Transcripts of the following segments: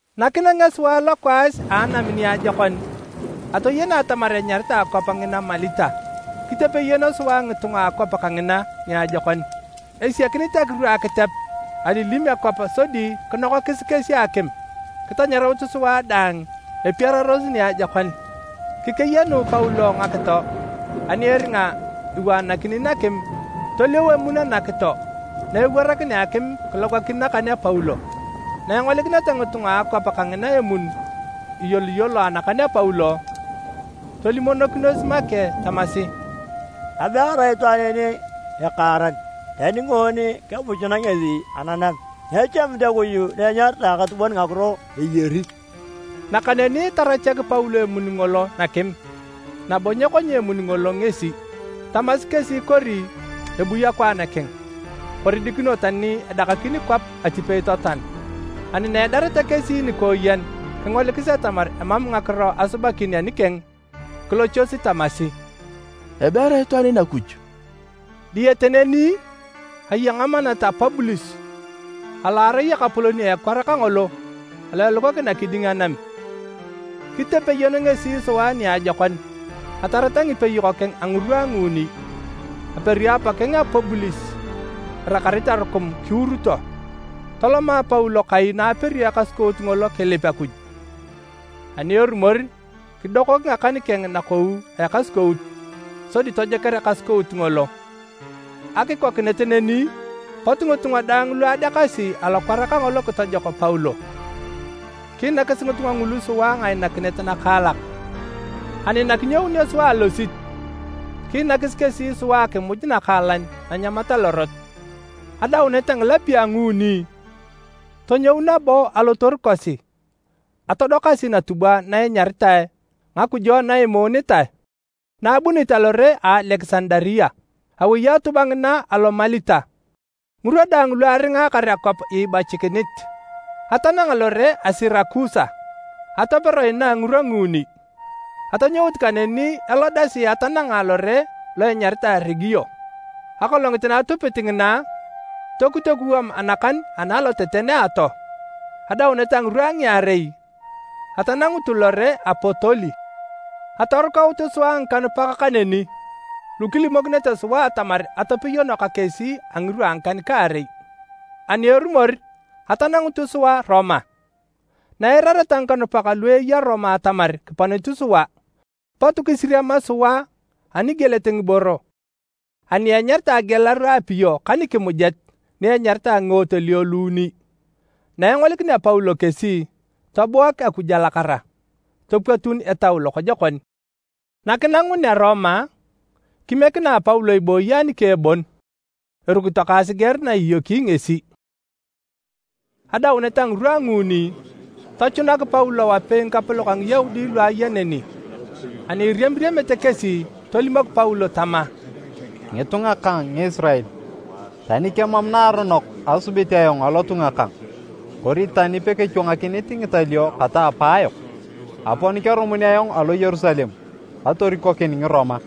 Nakinangea sua lokwaas a anam niajokon, atoyena atamar enyaritae akwap ngina Malita. Kitepeyono sua ngitunga a akwap kangina niajokon. Esiakinit akiru akitep alilim akwap sodi kinokakis kesi akim kitanyaraut sua daang epiararos niajokon. Kikeyanu Paulo ngakito ani eringa iwaanakini nakim, toliau emun anakito na ewarakinea akim kilogakin nakan a Paulo. Na engolikineta ngitunga a akwap kangina emun iyoloyolo anakan a Paulo, tolimokinos make tamasi, “Abe erai itwaan en ekaaran, tani ngoon kebuchuna ngesi ananam, nyechamit Akuj na enyaritae Akatubon ngakiro eyari.” Nakaneni tarachak Paulo emun ngolo nakim nabo nyekonya emun ngolo ngesi. Tamasi kesi kori ebui akwaan keng, kori dikino tani edakakin kwap atipei totoan. Ani na edareta kesi nikooyen kingolikis atamar emam ngakiro asubakin anikeng, kilochosi tamasi, “Abe erai itwaan en Akuj!” Diyete neni, aya ngamanat a Pubulis alo arai ekapolon a ekwar kangolo alo elukakina kiding anam. Kitepeyon ngesi sua niajokon atarata ngipeyok keng a ngirwa a nguuni. Aperi apakeng a Pubulis irakarit arukum, kiuruto. Toloma Paulo kai na aperio ekasukout ngolo kilip Akuj. Ani erumor, kidokok ngakan keng nakou a ekasukout, sodi tojoker ekasukout ngolo. Akikokinet neni, pot ngitunga daang lu adekasi alokwar kangolo kitojok Paulo. Kiinakis ngitunga ngulu sua ngainakinet nakaalak. Ani nakinyounio sua alosit, kiinakis kesi sua akimuj nakaalan nanyamat alorot. Adaunet a ngilapio a nguuni, tonyou nabo alotoru kosi atodokasi natubwa na enyaritae “Ngakujo na Imuunitae” na abunit alore a Alekisandaria. Awei atubwa ngina alo Malita ngirwa daang lu aringaakar akwap iibachikinit. Atananga lore a Sirakusa, atopero inaa ngirwa nguuni. Atonyoutu kaneni elodasi atananga lore lo enyaritae Regio. Akolongit na atupit ngina, tokut ekuwam anakan ana aloteten a atoo. Adaunet a ngirwa a ngiarei, atanangutu lore a Potoli. Atorukautu sua ngikanupak kaneni lu kilimokinete sua atamar atepeyono ka kesi a ngirwa a ngikan-kaarei. Ani erumor, atanangutu sua Roma. Na eirareta ngikanupak lu eya Roma atamar kiponit sua, pot kisiriama sua anigielet ngiboro ani enyaritae Agialaru a Apio ka nikimujet ni enyaritae Ngiotelio Luuni. Na engolikinea Paulo kesi, tobuak Akuj alakara, topwatun etau lokojokon. Nakinangunea Roma, kimiekinae Paulo ibooyi anikeng bon erukito ka asiger na iyoki ngesi. Adaunet a ngirwa a nguuni, tochunak Paulo wapei ngikapolok a Ngiyaudi lu aya neni. Ani iriamiriamete kesi, tolimok Paulo tama, “Ngitunga kang Ngisirael, tani kemam naaronok asubit ayong alotunga kang kori tani pekechwangakinit ngitalio kata apaayok, apon kerumun ayong alo Yerusalem katorikokin Ngiroma.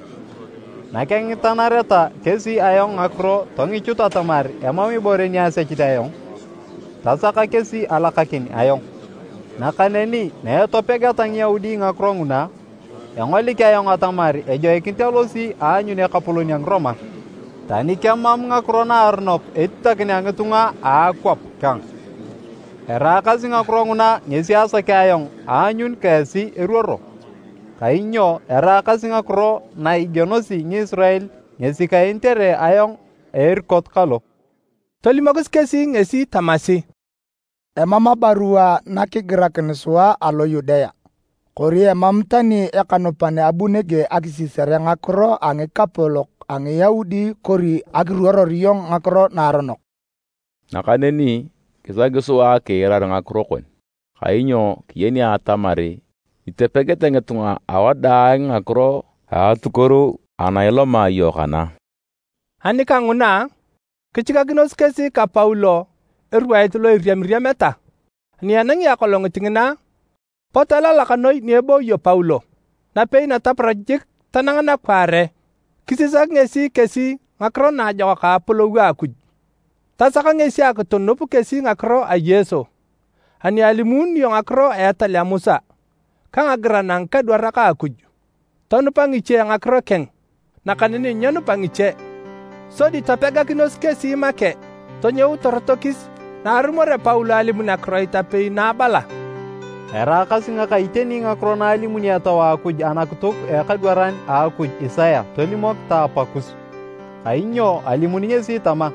Nakengitanareta kesi ayong ngakiro tongichut atamar emam ibore ni asechit ayong, tasaka kesi alakakin ayong. Nakaneni na etopegeta Ngiyaudi ngakiro nguna, engolik ayong atamar ejoikinit alosi aanyun ekapolon a Ngiroma, tani kemam ngakiro naaronok etitakinea ngitunga a akwap kang. Eraakasi ngakiro nguna ngesi asakea ayong aanyun ka esi eruoro, kainyo eraakasi ngakiro na igienosi Ngisirael ngesi kaenitere ayong a erikot kalo.” Tolimokis kesi ngesi tamasi, “Emam abarua nakigirakin sua alo Yudea, kori emam tani ekanupan abu nege akisisare ngakiro a ngikapolok a Ngiyaudi kori akiruoror iyong ngakiro naaronok. Nakaneni kisaki sua akiirar ngakiro kon, kainyo kiyeni atamar itopegete ngitunga awadaang ngakiro a atukuoru ana iloma iyong kana.” Ani kanguna, kichikakinos kesi ka Paulo erwait lo iriamiriameta. Ani enangi akolongit ngina, pot elalak noi ni ebooyo Paulo. Napei nataparach jik tanang nakwaare, kisisak ngesi kesi ngakiro naajokak a apolou a Akuj. Tasak ngesi akitunup kesi ngakiro a Yesu ani alimuununio ngakiro a etal a Musa ka ngagiran a ngikadwarak a Akuj. Tonupa ngiche ngakiro keng, nakaneni nyenupa ngiche. Sodi topegakinos kesi make tonyout torotokis naarumorea Paulo alimun akiroit apei na abala, “Eraakasi ngaka iteni ngakiro na alimuni Etau a Akuj anakituk a ekadwaran a Akuj Isaya tolimok ta apakus! Kainyo alimuni ngesi tama,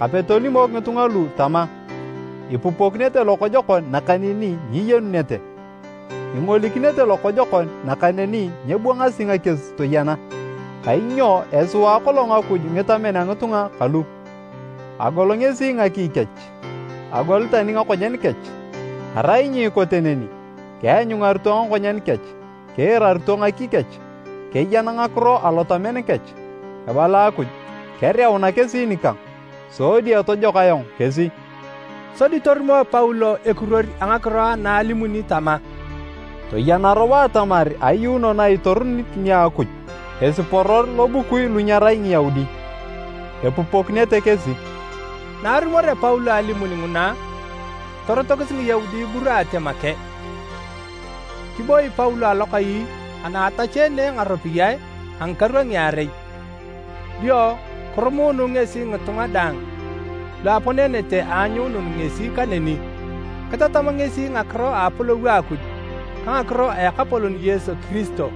‘Kape tolimok ngitunga lu tama, Ipupokinete lokojokon nakaneni nyiyenunete, ingolikinete lokojokon nakaneni nyebwangasi ngakies toyena. Kainyo esiwaa kolong Akuj ngitamen a ngitunga kalu, agol ngesi ngaki kech, agol tani ngakonyen kech. Arai nyikote neni, keanyungarito ngakonyen kech, kiirarito ngaki kech, keyan ngakiro alotamen kech, ebala Akuj, kereuna kesi nikang, sodi etojok ayong kesi.’” Sodi torumo Paulo ekiruor a ngakiro ana alimuni tama, “Toyena robo atamar ayuuno na itorunit nia Akuj, esiporor lobukui lu nyerai Ngiyaudi. Epupokinete kesi!” [ Na arumorea Paulo alimun nguna, torotokis Ngiyaudi iburaate make.] Kiboi Paulo alokai ana atacheene ngaropiyae a ngikaru a ngiarei. Dio kirumuunu ngesi ngitunga daang lu aponenete aanyuunun ngesi kaneni. Kitatam ngesi ngakiro a apolou a Akuj ka ngakiro a Ekapolon Yesu Kiristo.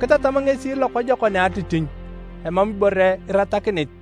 Kitatam ngesi lokojokon a atitinyu emam ibore iratakinit.